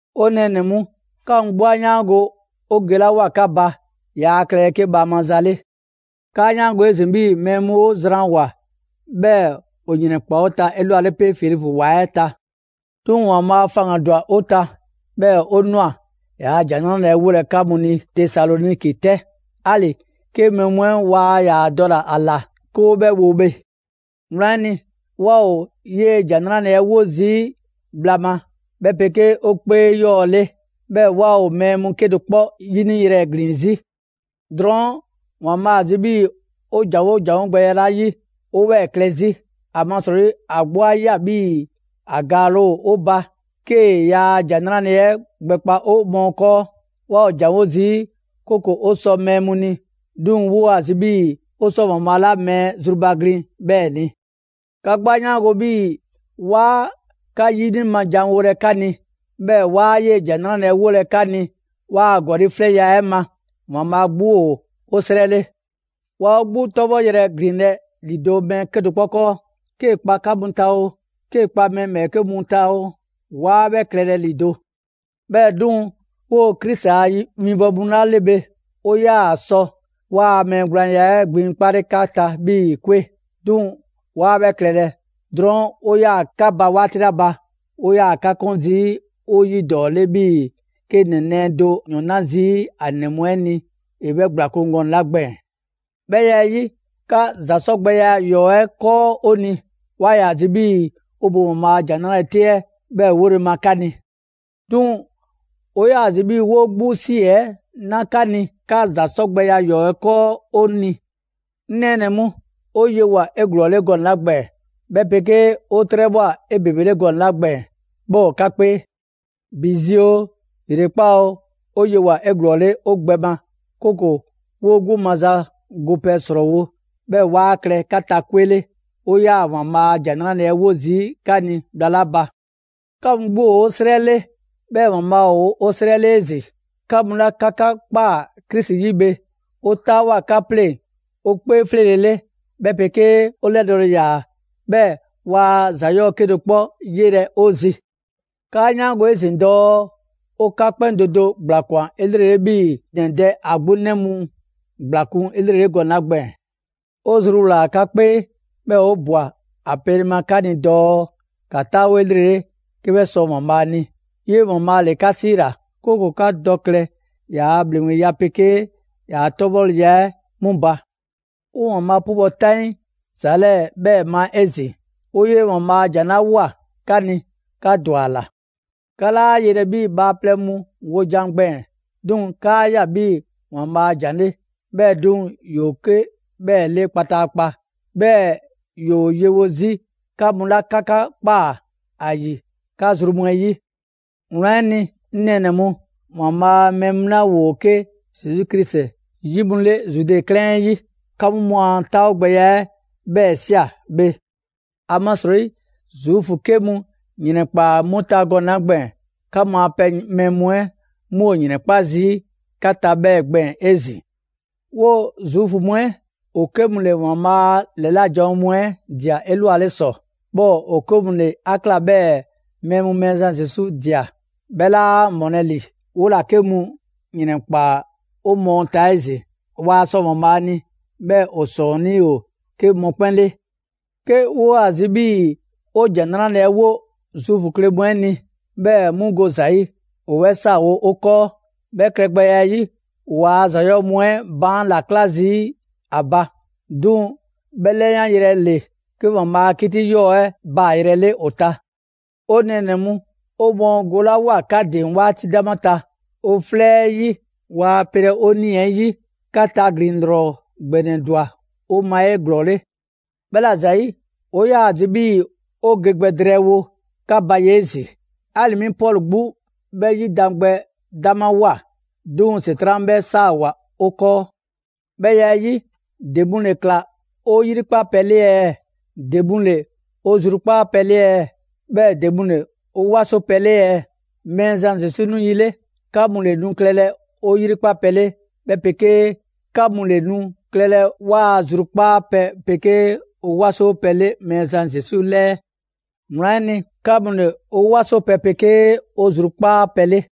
'Ŋ nɛɛnɛ‑ mu, 'ka mu 'gbu 'a 'yaango‑ 'o gelawoa 'ka ba, yaa klɛlɛ 'ke bhaama za 'le. 'Kaa 'yaango‑ 'ezin‑ 'bhii‑ mɛɛ mu 'o ‑zwanwoa, 'bhɛɛ‑ ‑o ‑yrɛnkpaa 'o ta 'elwale 'pe Filipu ‑wa 'ɛ ta. 'Duŋ‑ ‑Waanbhaa' faŋgandwa 'o ta, 'bhɛɛ‑ 'o ꞊nwa ‑yaa' ‑Jan 'Nrale‑ 'ɛ 'wolɛ‑ 'ka mu ni Tesaloniki 'tɛ, 'ali‑ 'ke mɛɛ mu 'ɛ waa ‑yaa dɔle‑ ‑a ꞊la 'ke 'o 'bhɛ wo bhe. Wlan 'ɛ ni, 'waa ‑o 'yee‑ ‑Jan 'Nrale‑ 'ɛ 'wo zii' bhla ma, 'bhɛ 'pegee 'o 'kpee 'yɔɔ‑ 'le. 'Bhɛɛ‑ 'waa ‑o mɛɛ 'kedo‑ 'kpɔ 'yiniyrɛ ‑glin 'zi. Drɔɔn' ‑Waanbhaa' ‑a zi 'bhii‑ 'o ‑janwo' ‑janwo' gbɛya 'la 'yi, 'woo‑ 'bhɛɛ‑ klɛ 'zi. ‑Amasrɔyi, ‑a 'gbu 'a ꞊ya 'bhii‑ ‑a ‑gaale' 'o ba 'kee‑ ‑yaa' ‑Jan 'Nrale‑ 'ɛ gbɛkpa 'o mɔɔ 'kɔɔ. 'Waa ‑o ‑janwo' zii', 'kooko‑ 'o sɔ mɛɛ mu ni, 'duŋ‑ 'woo‑ ‑a zi 'bhii‑ 'o sɔ ‑Waanbhaa' 'la mɛɛ zrubaglin 'bhɛɛ‑ ni. 'Ka 'gbu 'a 'yaango‑ 'bhii‑ 'waa 'ka 'yini ma ‑janwolɛ 'ka ni; 'bhɛɛ‑ 'waa 'yee‑ ‑Jan 'Nrale‑ 'ɛ wolɛ 'ka ni 'waa ‑gɔli' 'flɛŋya‑ 'ɛ ma, ‑Waanbhaa' 'gbu ‑o 'o 'srɛ 'le. 'Waa 'o 'gbu 'tɔbhɔyrɛ ‑glinlɛ' ‑lido' mɛɛ 'kedo‑ 'kpɔ 'kɔɔ: 'kee‑ 'kpa 'ka mu ta oo, 'kee‑ kpa mɛɛ ‑bhɛɛke' mu ta oo, 'waa 'bhɛ klɛlɛ ‑lido'. 'Bhɛɛ‑ 'duŋ‑, 'woo‑ Krisi a winbɔwo mu 'la 'le bhe, 'o 'yaa‑ sɔ 'waa‑ mɛɛ gblaanya 'ɛ gbiŋkpale 'ka ta 'bhii‑ 'kwe. 'Duŋ‑ 'waa 'bhɛ klɛlɛ, drɔɔn' 'o 'yaa‑ 'ka ba 'waati 'la ba, 'o 'yaa‑ 'ka 'kun zii' 'o 'yidɔɔ‑ 'le 'bhii‑ 'ke ‑nɛ nɛɛ do ‑o ‑yɔn 'na zii' 'a 'nɛ 'ɛ ni ‑e 'bhɛ ‑gblakun' gɔnɛ‑ 'la gbɛɛn‑. 'Bhɛ ya 'ɛ 'yi, 'ka ‑za 'sɔ gbɛ ‑yɔɔ' 'ɛ 'kɔɔ 'o ni, 'waa ‑yaa zi 'bhii‑ 'o bo ‑Waanbhaa' a ‑Jan 'Nrale‑ 'te 'ɛ 'bhɛ 'wole‑ ma 'ka ni; 'duŋ‑ 'o 'yaa‑ zi 'bhii‑ 'woo 'gbu 'si 'ɛ 'na 'ka ni 'ka ‑za 'sɔ gbɛ ‑yɔɔ' 'ɛ 'kɔɔ 'o ni. 'Ŋ nɛɛnɛ‑ mu, 'o yewoa꞊ 'eglɔɔle gɔnɛ‑ 'la gbɛɛn‑, 'bhɛ 'pegee 'o 'trɛbhwa꞊ 'ebebele gɔnɛ‑ 'la gbɛɛn‑ 'bhɛ ‑o 'ka 'kpee: ‑bi zi oo, ‑yrekpaa' oo, 'o yewoa꞊ 'eglɔɔle 'o gbɛ ma, 'kooko‑ 'woo 'gbu maza gopɛ ‑srɔɔwo', 'bhɛɛ‑ 'waa klɛ 'ka ta 'kwe 'le, 'o 'yaa‑ ‑Waanbhaa' a ‑Jan 'Nrale‑ 'ɛ 'wo zii' 'ka ni bhla 'la ba. 'Ka mu 'gbu ‑o 'o 'srɛ 'le, 'bhɛɛ‑ ‑Waanbhaa' ‑o 'o 'srɛ 'le 'ezin‑. 'Ka mu 'la 'ka 'ka ꞊kpaa Krisi 'yi bhe, 'o 'taawoa꞊ 'ka 'pleŋ‑ 'o 'kpee 'fleele‑ 'le, 'bhɛ 'pegee 'o 'lɛdɔɔle ‑yaa, 'bhɛɛ‑ waa ‑za 'yɔɔ‑ 'kedo‑ 'kpɔ 'yelɛ‑ 'o zi. 'Kaa 'yaango‑ 'ezin‑ dɔɔ 'o 'ka 'kpɛn do do ‑gblakwan 'elrele 'bhii‑ ‑nɛ dɛ ‑a 'gbu 'nɛ mu ‑gblakun' 'elrele gɔnɛ‑ 'la gbɛɛn‑. 'O zruwlaa꞊ 'ka 'kpee, 'bhɛɛ‑ 'o ꞊bwa ‑a pele ma 'ka ni dɔɔ ‑ka 'taawo 'elrele 'ke 'bhɛ sɔ ‑Waanbhaa' ni. 'Yee‑ ‑Waanbhaa' ‑le 'ka 'siila‑, 'kooko‑ 'ka dɔ klɛ ‑yaa' ‑bhleŋgbeya 'pegee ‑yaa' 'tɔbhɔleya 'ɛ 'mu ba. 'O ‑Waanbhaa' 'pubɔ‑ 'taŋii ‑za 'lɛɛ‑ 'bhɛɛ‑ ma 'ezin‑. 'O 'yee‑ ‑Waanbhaa' a ‑jan 'la ꞊woa 'ka ni, 'ka ‑dwa ‑a ꞊la. 'Ka 'laa 'yelɛ‑ 'bhii bhaaplɛŋ mu wojan gbɛɛn‑; 'duŋ‑ 'kaa ꞊ya 'bhii‑ ‑Waanbhaa' a ‑jan 'le. 'Bhɛɛ‑ 'duŋ‑ ‑yoo 'ke 'bhɛɛ‑ 'le kpataakpa. 'Bhɛɛ‑ ‑yoo yewo 'zi 'ka mu 'la 'ka 'ka ꞊kpaa ‑a ‑yi 'ka zru mu 'ɛ 'yi. Wlan 'ɛ ni, 'ŋ nɛɛnɛ‑ mu, ‑Waanbhaa' a mɛɛ mu 'la ‑woo 'ke Zesu Krisi 'yi a pɛ 'le Zude 'klɛɛn 'ɛ 'yi, 'ka mu 'mu a 'taawogbɛya 'ɛ 'bhɛɛ‑ ꞊sia bhe; ‑amasrɔyi Zuufu 'ke mu ‑yrɛnkpaa 'mu ta gɔnɛ‑ 'la gbɛɛn‑, 'ka mu a pɛ mɛɛ mu 'ɛ 'mu ‑o ‑yrɛnkpa' zii' 'ka ta 'bhɛɛ‑ gbɛɛn‑ 'ezin‑. 'Woo‑ Zuufu mu 'ɛ, ‑o 'ke mu ‑le ‑Waanbhaa' a ‑lɛla' janwo mu 'ɛ ꞊dia 'elwale ‑sɔ; 'bhɛɛ‑ ‑o 'ke mu ‑le 'a ꞊kla 'bhɛɛ‑ mɛɛ mu Mɛɛzan Zesu ꞊dia; 'bhɛ 'laa ‑mɔlɛ' ‑li, 'wola‑ 'ke mu ‑yrɛnkpaa 'o mɔɔ ta 'ezin‑. Waa sɔ ‑Waanbhaa' ni, 'bhɛɛ‑ ‑o ‑sɔɔnnii' ‑o 'ke mɔkpɛn' 'le. 'Ke 'woo‑ ‑a zi 'bhii‑ 'o ‑Jan 'Nrale‑ 'ɛ 'wo Zuufu kle mu 'ɛ ni, 'bhɛɛ‑ 'mu go ‑za 'yi, ‑o 'bhɛ 'saawo‑ 'o 'kɔɔ. 'Bhɛ klɛgbɛya 'ɛ 'yi, ‑o waa ‑za 'yɔɔ‑ mu 'ɛ baan' ‑la 'kla zii' 'a ba. 'Duŋ‑ 'bhɛ 'lɛyanyrɛ ‑le 'ke ‑Waanbhaa' a 'kiti 'yɔɔ‑ 'ɛ baayrɛ 'le ‑o ta. 'O nɛɛnɛ‑ mu, 'o mɔɔ golawoa 'ka ‑din 'waati 'dama ta 'o 'flɛ 'ɛ 'yi, waa pelɛ 'o 'nii‑ 'ɛ 'yi, 'ka taglin‑ 'lrɔ ‑gbɛnɛ ‑dwa 'o ma 'eglɔɔle. 'Bhɛla‑ ‑zayi', 'o 'yaa‑ zi 'bhii‑ 'o ge gbɛ drɛɛwo 'ka ba ye 'ezin‑, 'ali‑ 'mi Pɔlu 'gbu 'bhɛ 'yidangbɛ 'damawoa; 'duŋ‑ ‑Setran' 'bhɛ 'saawoa‑ 'o 'kɔɔ. 'Bhɛ ya 'ɛ 'yi, ‑de mu ‑le ꞊kla 'o 'yrikpa pɛ 'le ɛɛ? ‑De mu ‑le 'o zrukpaa' pɛ 'le ɛɛ? 'Bhɛɛ‑ ‑de mu ‑le 'o 'wasowo pɛ 'le ɛɛ? Mɛɛzan Zesu 'nu yi 'le, 'ka mu ‑le nu klɛlɛ 'o 'yrikpa pɛ 'le, 'bhɛ 'pegee, 'ka mu ‑le nu klɛlɛ 'waa‑ zrukpaa pɛ 'pegee 'o 'wasowo pɛ 'le Mɛɛzan Zesu 'lɛɛ. Wlan 'ɛ ni, 'ka mu ‑le 'o 'wasowo pɛ pegee 'o zrukpaa' pɛ 'le.